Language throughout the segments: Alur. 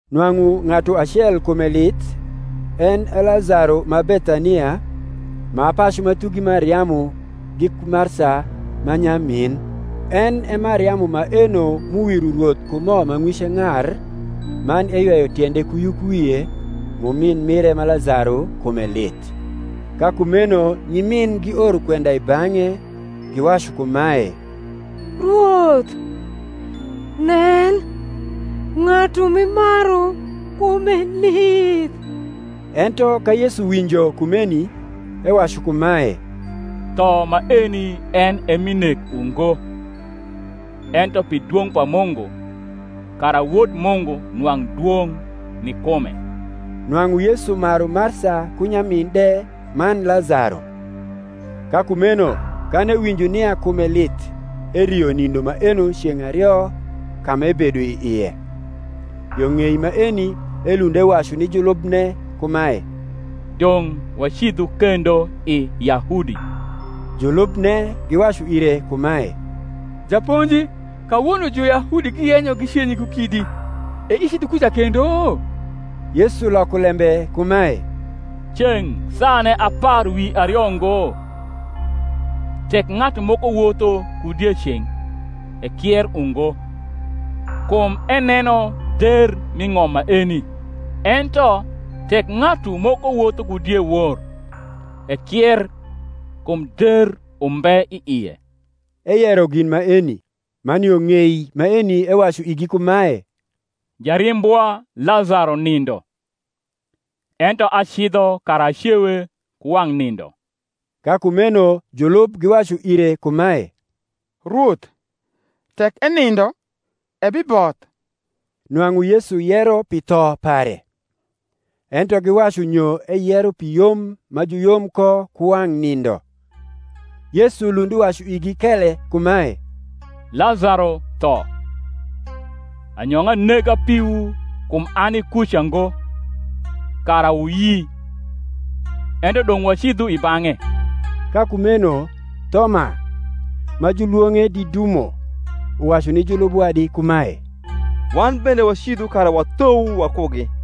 Nwang’u ng’atu acel kume lith, en e Lazaro ma Bethania, ma pacu ma thugi Mariamu giku Marsa ma nyamin. En e Mariamu maeno m’uwiro Rwoth ku mo ma ng’wice ng’ar, man eyweyo tiende ku yukwie, m’umin mire ma Lazaro kume lith. Ka kumeno nyimin gioro kwenda i bang’e, giwacu kumae, Rwoth, nen, ng’atu m’imaru kume lith. Ento ka Yesu winjo kumeni, ewacu kumae, Tho maeni en e mi nek ungo, ento pi dwong’ pa Mungu, kara Wod Mungu nwang’ dwong’ ni kume. Nwang’u Yesu maru Marsa ku nyamin de man Lazaro. Ka kumeno kan ewinjo nia kume lith erio nindo maeno ceng’ ario ka m’ebedo i ie. Yo ng’ei maeni elund ewacu ni julubne kumae, Dong’ wacidhu kendo i Yahudi. Julubne giwacu ire kumae, Japonji, kawono Juyahudi giyenyo gicenyi ku kidi; e icidho kuca kendo? Yesu loko lembe kumae, Ceng’ saane apar wi ario ngo? Tek ng’atu moko wotho ku dieceng’, ekier ungo, kum eneno der mi ng’om maeni. Ento tek ng’atu moko wotho ku diewor, ekier, kum der umbe i ie. Eyero gin maeni: man yo ng’ei maeni ewacu igi kumae, Jarimbwa Lazaro nindo; ento acidho kara acewe ku wang’ nindo. Ka kumeno julub giwacu ire kumae, Rwoth, tek enindo, ebiboth. Nwang’u Yesu yero pi tho pare: ento giwacu nyo eyero pi yom ma juyom ko ku wang’ nindo. Yesu lund uwacu igi kele kumae, Lazaro tho. Anyong’a nega piwu kum ani kuca ngo, kara wuyi; ento dong’ wacidhu i bang’e. Ka kumeno Thoma, ma julwong’e Didumo, uwacu ni julub wadi kumae, Wan bende wacidhu kara wathou wakugi.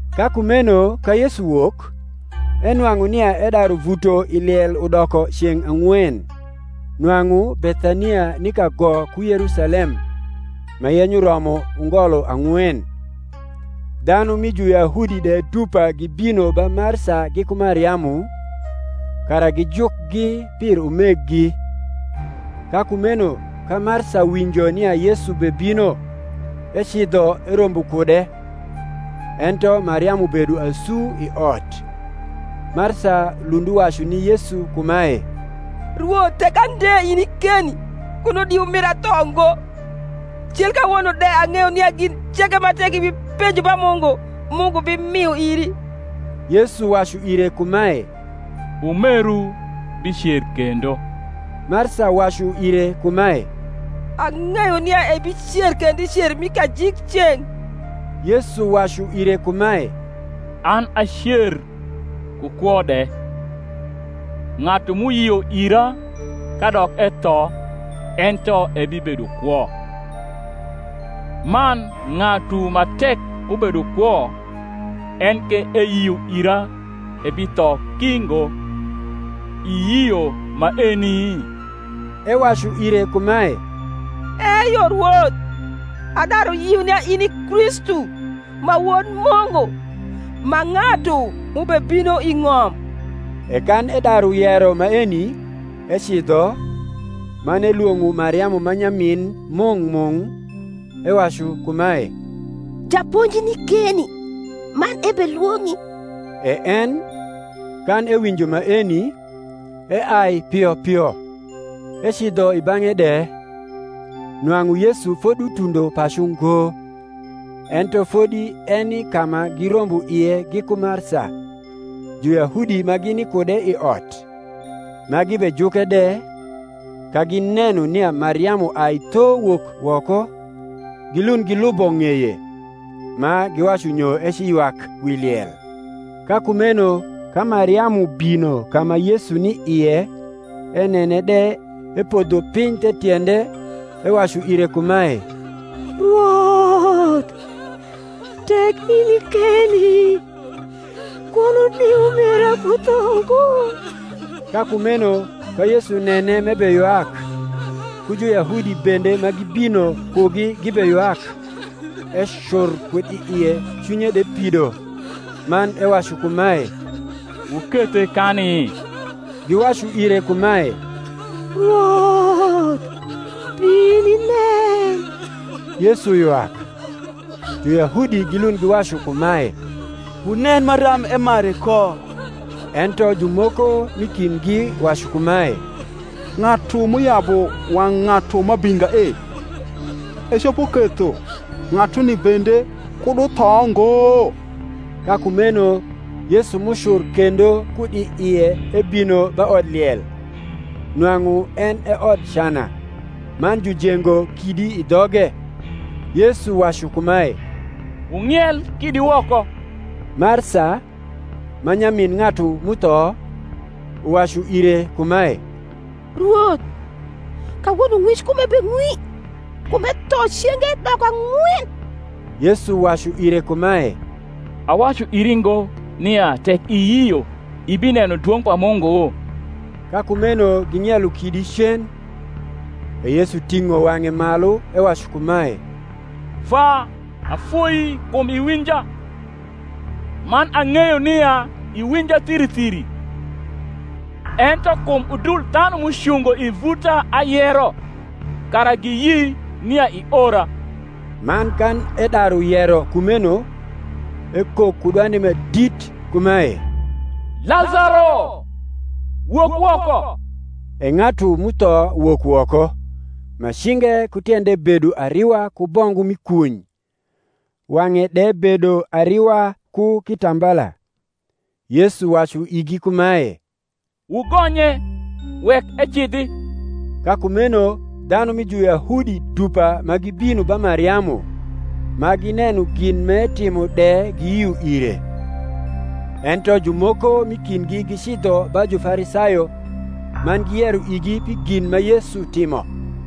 Ka kumeno ka Yesu wok, enwang’u nia edaru vuto i liel udoko ceng’ ang’wen. Nwang’u Bethania ni kago ku Yerusalem, ma yenyo romo ungolo ang’wen; dhanu mi Juyahudi de dupa gibino ba Marsa giku Mariamu, kara gijukgi pir umeggi. Ka kumeno ka Marsa winjo nia Yesu bebino, ecidho erombo kude: ento Mariamu bedo asu i ot. Marsa lund uwacu ni Yesu kumae, Rwoth tek ande ini keni, kuno di umira tho ngo. Cil kawono de ang’eyo nia gin ceke ma tek ibipenjo ba Mungu, Mungu bimio iri. Yesu wacu ire kumae, Umeru bicer kendo. Marsa wacu ire kumae, Ang’eyo nia ebicer kendo i cer mi kajikceng’. Yesu wacu ire kumae, An a cer, ku kwo de: ng’atu m’uyio ira kadok etho ento ebibedo kwo; man ng’atu ma tek ubedo kwo en ke eyio ira ebitho ki ngo. Iyio maeni? Ewacu ire kumae, Eyo, Rwoth: adaru yio nia in i Kristu ma Wod Mungu, ma ng’atu m’ubebino i ng’om. E kan edaru yero maeni, ecidho, man elwong’o Mariamu ma nyamin mung’ mung’, ewacu kumae, Japonji ni keni, man ebelwong’i. E en, kan ewinjo maeni, eai pio pio, ecidho i bang’e de. (Nwang’u Yesu fodutundo pacu ngo, ento fodi eni ka ma girombo ie giku Marsa.) Juyahudi ma gini kude i ot, ma gibejuke de, ka gineno nia Mariamu ai tho wok woko, gilund gilubo ng’eye, ma giwacu nyo eciywak wi liel. Ka kumeno ka Mariamu bino ka ma Yesu ni ie enene de, epodho piny the tiende, ewacu ire kumae, Rwoth, tek ini keni, kuno di umira kutho ngo. Ka kumeno ka Yesu nene m’ebeywak, ku Juyahudi bende ma gibino kugi gibeywak, ecur kud i ie cwinye de pido, man ewacu kumae, Wukethe kani? Giwacu ire kumae, Rwoth, bin inen. Yesu ywak. Juyahudi gilund giwacu kumae, Wunen maram emare ko! Ento jumoko m’i kindgi wacu kumae, Ng’atu m’uyabu wang’ ng’atu ma abinga e, ecopo ketho ng’atuni bende kud utho ngo? Ka kumeno Yesu m’ucur kendo kud i ie ebino ba odliel. Nwang’u en e odcana, man jujengo kidi i dhoge. Yesu wacu kumae, Wung’iel kidi woko. Marsa, ma nyamin ng’atu m’utho, uwacu ire kumae, Rwoth, kawono ng’wic kume beng’wi; kum etho cenge doko ang’wen. Yesu wacu ire kumae, Awacu iri ngo, nia, tek iyio, ibineno dwong’ pa Mungu? Ka kumeno ging’ielo kidi cen. E Yesu ting’o wang’e malu ewacu kumae, Vwa, afoii kum iwinja. Man ang’eyo nia iwinja thiri thiri: ento kum udul dhanu m’ucungo i vuta ayero, kara giyi nia iora. Man kan edaru yero kumeno, ekok ku dwande ma dit kumae, Lazaro, wok woko. E ng’atu m’utho wok woko, ma cinge ku tiende bedo ariwa ku bongu mi kuny; wang’e de bedo ariwa ku kitambala. Yesu wacu igi kumae, Wugonye, wek ecidhi. Ka kumeno dhanu mi Juyahudi dupa ma gibino ba Mariamu, ma gineno gin m’etimo de giyio ire. Ento jumoko m’i kindgi gicidho ba Jufarisayo, man giyero igi pi gin ma Yesu timo.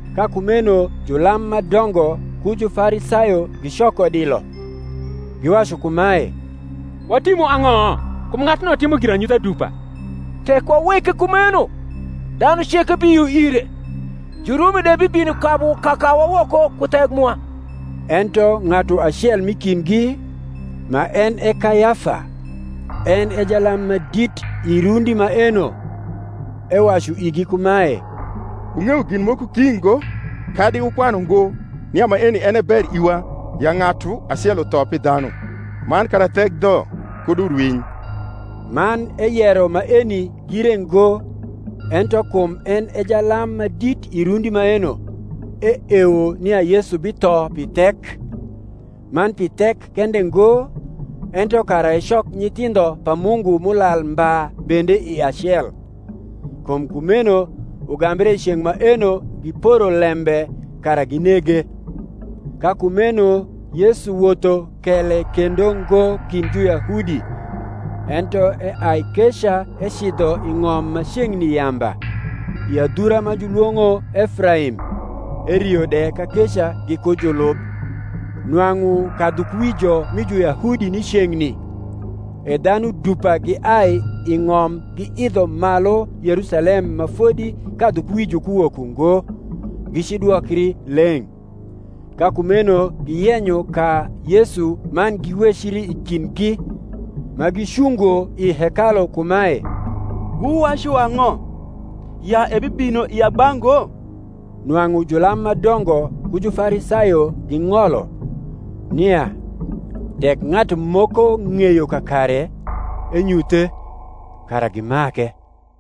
Ka kumeno julam ma dongo ku Jufarisayo gicoko dilo, giwacu kumae, Watimu ang’o? kum ng’atuno timo giranyutha dupa. Tek waweke kumeno, dhanu ceke biyio ire: Jurumi de bibino kabu kakawa woko ku thek mwa. Ento ng’atu acel m’i kindgi, ma en e Kayafa, en e jalam ma dit i rundi maeno, ewacu igi kumae, Wung’eyo gin moko ki ngo, kadi wukwanu ngo nia maeni en e ber iwa ya ng’atu acel utho pi dhanu, man kara thek dho kud urwiny. Man eyero maeni gire ngo: ento kum en e jalam ma dit i rundi maeno, eewo nia Yesu bitho pi thek; man pi thek kende ngo, ento kara ecok nyithindho pa Mungu m’ulal mba bende i acel. Kum kumeno ugambre i ceng’ maeno giporo lembe kara ginege. Ka kumeno Yesu wotho kele kendo ngo kind Juyahudi, ento eai keca ecidho i ng’om ma ceng’ni yamba, i adhura ma julwong’o Efraim; erio de kakeca giku julub. Nwang’u kadhukuwijo mi Juyahudi ni ceng’ni: e dhanu dupa giai i ng’om giidho malu Yerusalem ma fodi kadhukuwijo kuwok ungo, gicidwokri leng’. Ka kumeno giyenyo ka Yesu man giwecri i kindgi, ma gicungo i hekalu kumae, Wuwacu ang’o? Ya ebibino i agba ngo? Nwang’u julam ma dongo ku Jufarisayo ging’olo, nia, tek ng’atu moko ng’eyo kakare, enyuthe, kara gi make.